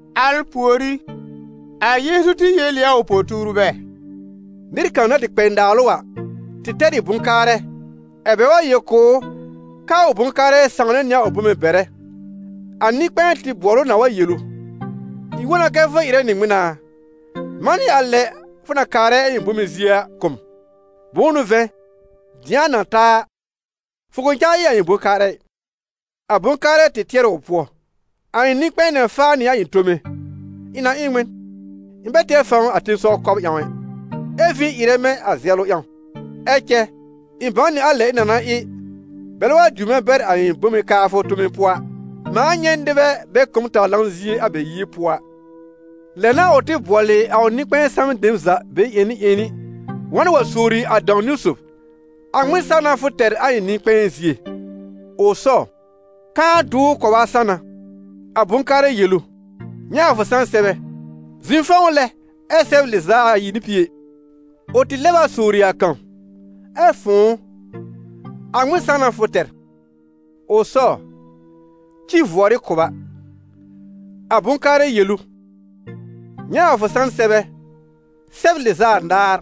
Al pùorí, a Yeezu tɩ yel ɩ a ʋ po-tuurbɛ: «Nɩr kãw na tɩ kpɛ naalʋ a, tɩ tɛr ɩ bʋ̃-kaarɛ, ɛ̀ bɛ wa yel kʋ̀ ʋ k'aa ʋ bʋ̃-kaarɛ sãwnɛ nɩ a ʋ bome bɛrɛ. A nɩ-kpɛ̃ɛ tɩ bʋɔl ʋ na wa yel ʋ: ‹Ɩ̃ wõ na kɛ fʋ ɩrɛ nɩ ŋmɩn a? Manɩ a lɛ fʋ na kaarɛ a ɩ̃ bome zie a kʋ̀ m, bʋ̃ʋ n'ʋ vɛ̃, dɩ̃a na ta a, fʋ kʋ̃ cãa ɩ a ɩ̃ bʋ̃-kaarɛ ɩ.› A bʋ̃-kaarɛ tɩ tɩɛr ɩ ʋ pʋɔ: ‹A ɩ̃ nɩ-kpɛ̃ɛ na faa nɩ a ɩ̃ tome. Ɩ̃ na ɩ n ŋmɩn? Ɩ̃ bɛ tɛr fãw a tẽsɔw kɔb ƴãw ɛ, ɛ vĩ ɩrɛ mɛ̃ a zɛlʋ ƴãw. Ɛ cɛ ɩ̃ bãw nɩ a lɛ ɩ̃ na na ɩ, bɛlɛ wa diw mɛ̃ bɛr a ɩ̃ bome kaafʋ tome pʋɔ a, mãa nyɛ̃ nɩbɛ bɛ kʋ̀ m taw-lanʋ zie a bɛ yie pʋɔ a.› Lɛ n'a ʋ tɩ bʋɔlɩ a ʋ nɩ-kpɛ̃ɛ samɛ dem za, be-ƴẽni ƴẽni, wa n wa sowri a dãw-niwn sob: ‹A ŋmɩn san n'a fʋ tɛr a ɩ̃ nɩ-kpɛ̃ɛ zie?› Ʋ sɔw: ‹Kãá dʋwr kʋba san n'a!› A bʋ̃-kaarɛ yel ʋ: ‹Nyɛ̃ a fʋ san sɛbɛ, zɩ̃ fɔ̃w lɛ ɛ sɛb lɩz'a ayi nɩ pie.› Ʋ tɩ lɛb a sowri a kãw: ‹Ɛ fʋ̃ʋ, a ŋmɩn san n'a fʋ tɛr?› Ʋ sɔw: ‹Ci vʋɔrɩ kʋba.› A bʋ̃-kaarɛ yel ʋ: ‹Nyɛ̃ a fʋ san sɛbɛ, sɛb lɩz'a anaar.›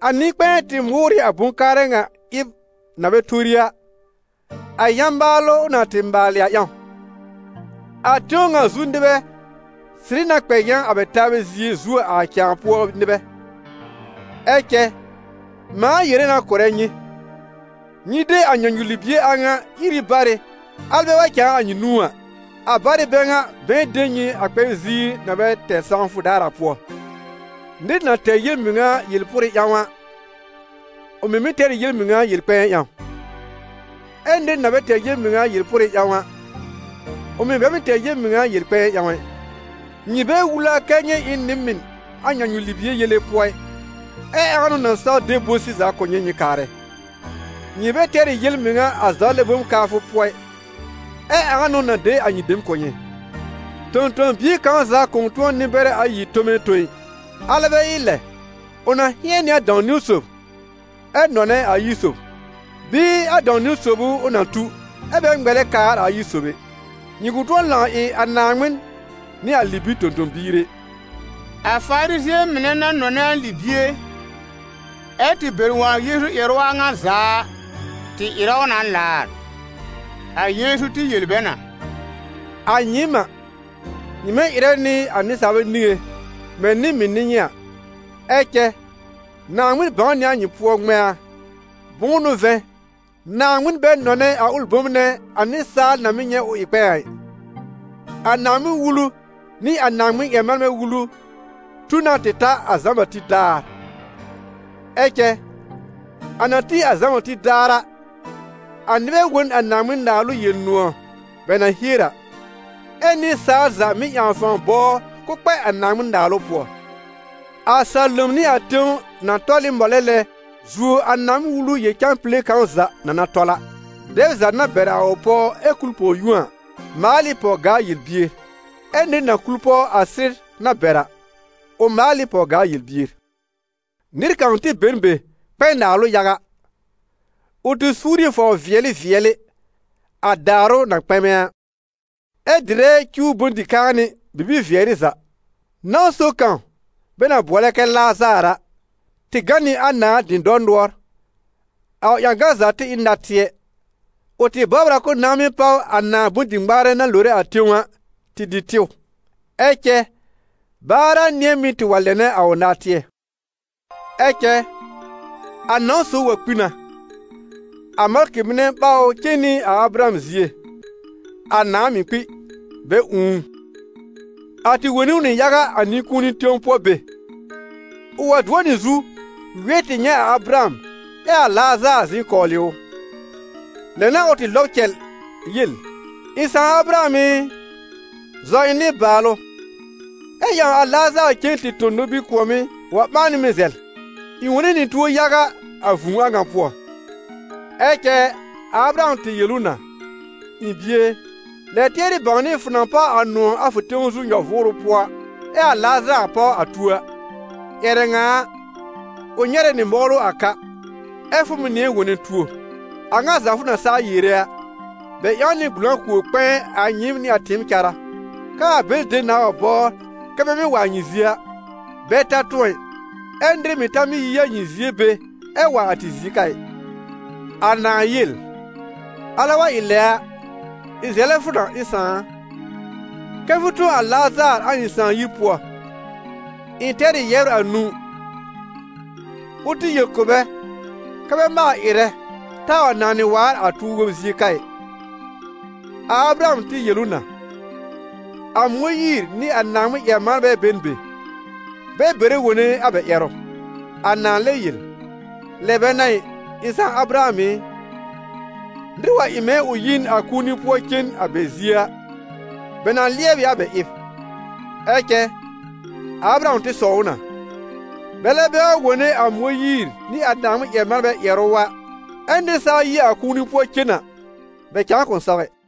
A nɩ-kpɛ̃ɛ tɩ mʋʋr ɩ a bʋ̃-kaarɛ ŋa ɩb na bɛ tori a, a yã-maalʋ ʋ na tɩ maalɩ a ƴãw. A tẽw ŋa zu nɩbɛ sɩrɩ na kpɛ yã a bɛ taabɛ zie zuo a cãa pʋɔ nɩbɛ.» «Ɛ cɛ mãa yere na kʋ̀rɛ nyɩ, nyɩ de a nyãnyu-libie a ŋa ír ɩ barɩ, alɛ bɛ wa cãa a nyɩ nũú a, a barɩ bɛ ŋa bɛ̃ɛ de nyɩ a kpɛb ziir na bɛ tɛr sãwfʋ daar a pʋɔ. Nɩr na tɛr yel-mɩŋa yel-pʋrɩ ƴãw a, ʋ mɩ̀ mɩ́ tɛr ɩ yel-mɩŋa yel-kpɛ̃ɛ ƴãw; ɛ nɩr na bɛ tɛr yel-mɩŋa yel-pʋrɩ ƴãw a, ʋ mɩ̀ bɛ mɩ́ tɛr yel-mɩŋa yel-kpɛ̃ɛ ƴãw ɛ. Nyɩ bɛ wul a kɛ nyɩ ɩ n nɩ-mɩn a nyãnyu-libie yele pʋɔ ɩ, ɛ ãa n'ʋ na saw de bʋ̃-sɩza kʋ̀ nyɩ nyɩ kaarɛ? Nyɩ bɛ tɛr ɩ yel-mɩŋa a zawlɛ bom kaafʋ pʋɔ ɩ, ɛ ãa n'ʋ na de a nyɩ dem kʋ̀ nyɩ?» «Tõ-tõ-bie kãw za kʋ̃ tʋ̃ɔ nɩ-bɛrɛ ayi tome tõ ɩ: alɛ bɛ ɩ lɛ, ʋ na hɩ̃ɛn nɩ a dãw-niwn sob ɛ nɔnɛ a ayi sob; bɩɩ a dãw-niwn sob ʋ ʋ na tu, ɛ bɛ ŋmɛlɛ kaar a ayi sob ɛ. Nyɩ kʋ̃ tʋ̃ɔ lãw ɩ a Naaŋmɩn nɩ a libir tõ-tõ-biir ɛ.» A Farizɩ̃ɛ mɩnɛ na nɔnɛ a libie, ɛ́ tɩ bɛr wõ a Yeezu ƴɛrʋ a ŋa za a, tɩ ɩrɛ ʋ na laar. A Yeezu tɩ yel bɛ na: «A nyɩɩm a, nyɩ mɩ́ ɩrɛ nɩ a nɩsaalbɛ niŋé mɛ̃ nɩ-mɩn n'ɩ nyɩ a, ɛ cɛ Naaŋmɩn bãw nɩ a nyɩ pʋɔ ŋmɛ̃a: bʋ̃ʋ n'ʋ vɛ̃, Naaŋmɩn bɛ nɔnɛ a ʋlɩ bom nɛ a nɩsaal na mɩ́ nyɛ̃ ʋ ɩ kpɛ̃ɛ a ɩ.» «A Naaŋmɩn-Wulu nɩ a Naaŋmɩn-ƴɛr-manbɛ wulu tu na tɩ ta a Zã-Bati daar. Ɛ cɛ a na tĩ a Zã-Bati daar a, a nɩbɛ wõ n a Naaŋmɩn-Naalʋ Yel-nʋ̃ɔ̀ bɛ na hier a, ɛ́ nɩsaal za mɩ́ ƴãw fãw bɔbr k'ʋʋ kpɛ a Naaŋmɩn-Naalʋ pʋɔ. A salom nɩ a tẽw na tɔl ɩ mɔlɛ lɛ zuo a Naaŋmɩn-Wulu yel-cãpile kãw za na na tɔl a.» «Dɛb za, na bɛr a ʋ pɔw ɛ kul pɔw-yũo a, maal ɩ pɔw-gaa yel-bier, ɛ́ nɩr na kul pɔw a sɩr na bɛr a, ʋ maal ɩ pɔw-gaa yel-bier.» «Nɩr kãw tɩ be n be kpɛ naalʋ yaga. Ʋ tɩ suur ɩ fɔbr-vɩɛlɩ vɩɛlɩ, a daarʋ na kpɛmɛ a, ɛ dɩrɛ cuw bʋ̃-dɩ-kãanɩ bibi-vɩɛrɩ za. Nãw sob kãw, bɛ na bʋɔlɛ kɛ Lazaar a, tɩ gã nɩ a nãà dɩ̃dɔr nʋɔr: a ʋ ƴãgan za tɩ ɩ n natɩɛ. Ʋ tɩ bɔbr a k'ʋʋ nãá mɩ́ páw a nãà bʋ̃-dɩ-ŋmaarɛ na lore a tẽw a tɩ dɩ tɩw, ɛ cɛ baar a nɩ̃ɛ mɩ́ tɩ wa lɛnɛ a ʋ natɩɛ. Ɛ cɛ a nãw sob wa kpi na, a malkɩ mɩnɛ ɓaw ʋ cen nɩ a Abraham zie; a nãà mɩ̀ kpi, bɛ ũù ʋ. A tɩ wone ʋ nɩ yaga a nɩ-kũuni tẽw pʋɔ be. Ʋ wa dʋɔ nɩ zu wɩɛr tɩ nyɛ̃ a Abraham, ɛ a Lazaar zɩ̃ kɔwlɩ ʋ. Lɛ n'a ʋ tɩ lɔb cɛl yel: ‹Ɩ̃ sãà Abraham ɩ, zɔ ɩ̃ nɩbaalʋ, ɛ ƴãw a Lazaar cen tɩ tõ nobir kʋ̃ɔ̀mɩ́ wa ɓãa nɩ mɛ̃ zɛl, ɩ̃ wone nɩ tuo yaga a vũu a ŋa pʋɔ.› Ɛ cɛ a Abraham tɩ yel ʋ na: ‹Ɩ̃ bie e, lɛb tɩɛrɩ bãwnɩ fʋ na páw a nʋ̃ɔ̀ a fʋ tẽw zu nyɔ-vʋʋrʋ pʋɔ, ɛ a Lazaar páw a tuo a. Ƴɛrɛ ŋa a, ʋ nyɛrɛ nɩ mɔwlʋ a ka, ɛ fʋ mɩ̀ nɩ̃ɛ wone tuo. A ŋa za fʋ na saa yere a, bɛ ƴãw nɩ gbʋlãkowr-kpɛ̃ɛ a nyɩɩm nɩ a tɩɩm cárá, kɛ́ a bɛlɩ dem nãa wa bɔbr kɛ bɛ mɩ́ wa a nyɩ zie a, bɛ ta tʋ̃ɔ ɩ, ɛ nɩr mɩ̀ ta mɩ́ yi a nyɩ zie be ɛ wa a tɩ zie ka ɩ.› A nãà yel: ‹Alɛ wa ɩ lɛ a, ɩ̃ zɛlɛ fʋ na, ɩ̃ sãà a, kɛ fʋ tõ a Lazaar a ɩ̃ sãà yir pʋɔ. Ɩ̃ tɛr ɩ yɛbr anũu. Ʋ tɩ yel kʋ̀ bɛ kɛ́ bɛ maal ɩrɛ, taa wa nanɩ waar a tuo-wob zie ka ɩ.› A Abraham tɩ yel ʋ na: ‹A Mõyiir nɩ a Naaŋmɩn-ƴɛr-manbɛ be n be, bɛ bɛrɛ wone a bɛ ƴɛrʋ.› A nãà lɛb yel: ‹Lɛ bɛ n'a ɩ, ɩ̃ sãà Abraham ɩ, nɩr wa ɩ mɛ̃ ʋ yi n a kũuni pʋɔ cen a bɛ zie a, bɛ na lɩɛb ɩ a bɛ ɩb.› Ɛ cɛ a Abraham tɩ sɔw ʋ na: ‹Bɛlɛ bɛ wa wone a Mõyiir nɩ a Naaŋmɩn-ƴɛr-manbɛ ƴɛrʋ a, ɛ nɩr saa yi a kũuni pʋɔ cen a, bɛ cãa kʋ̃ saw ɛ.›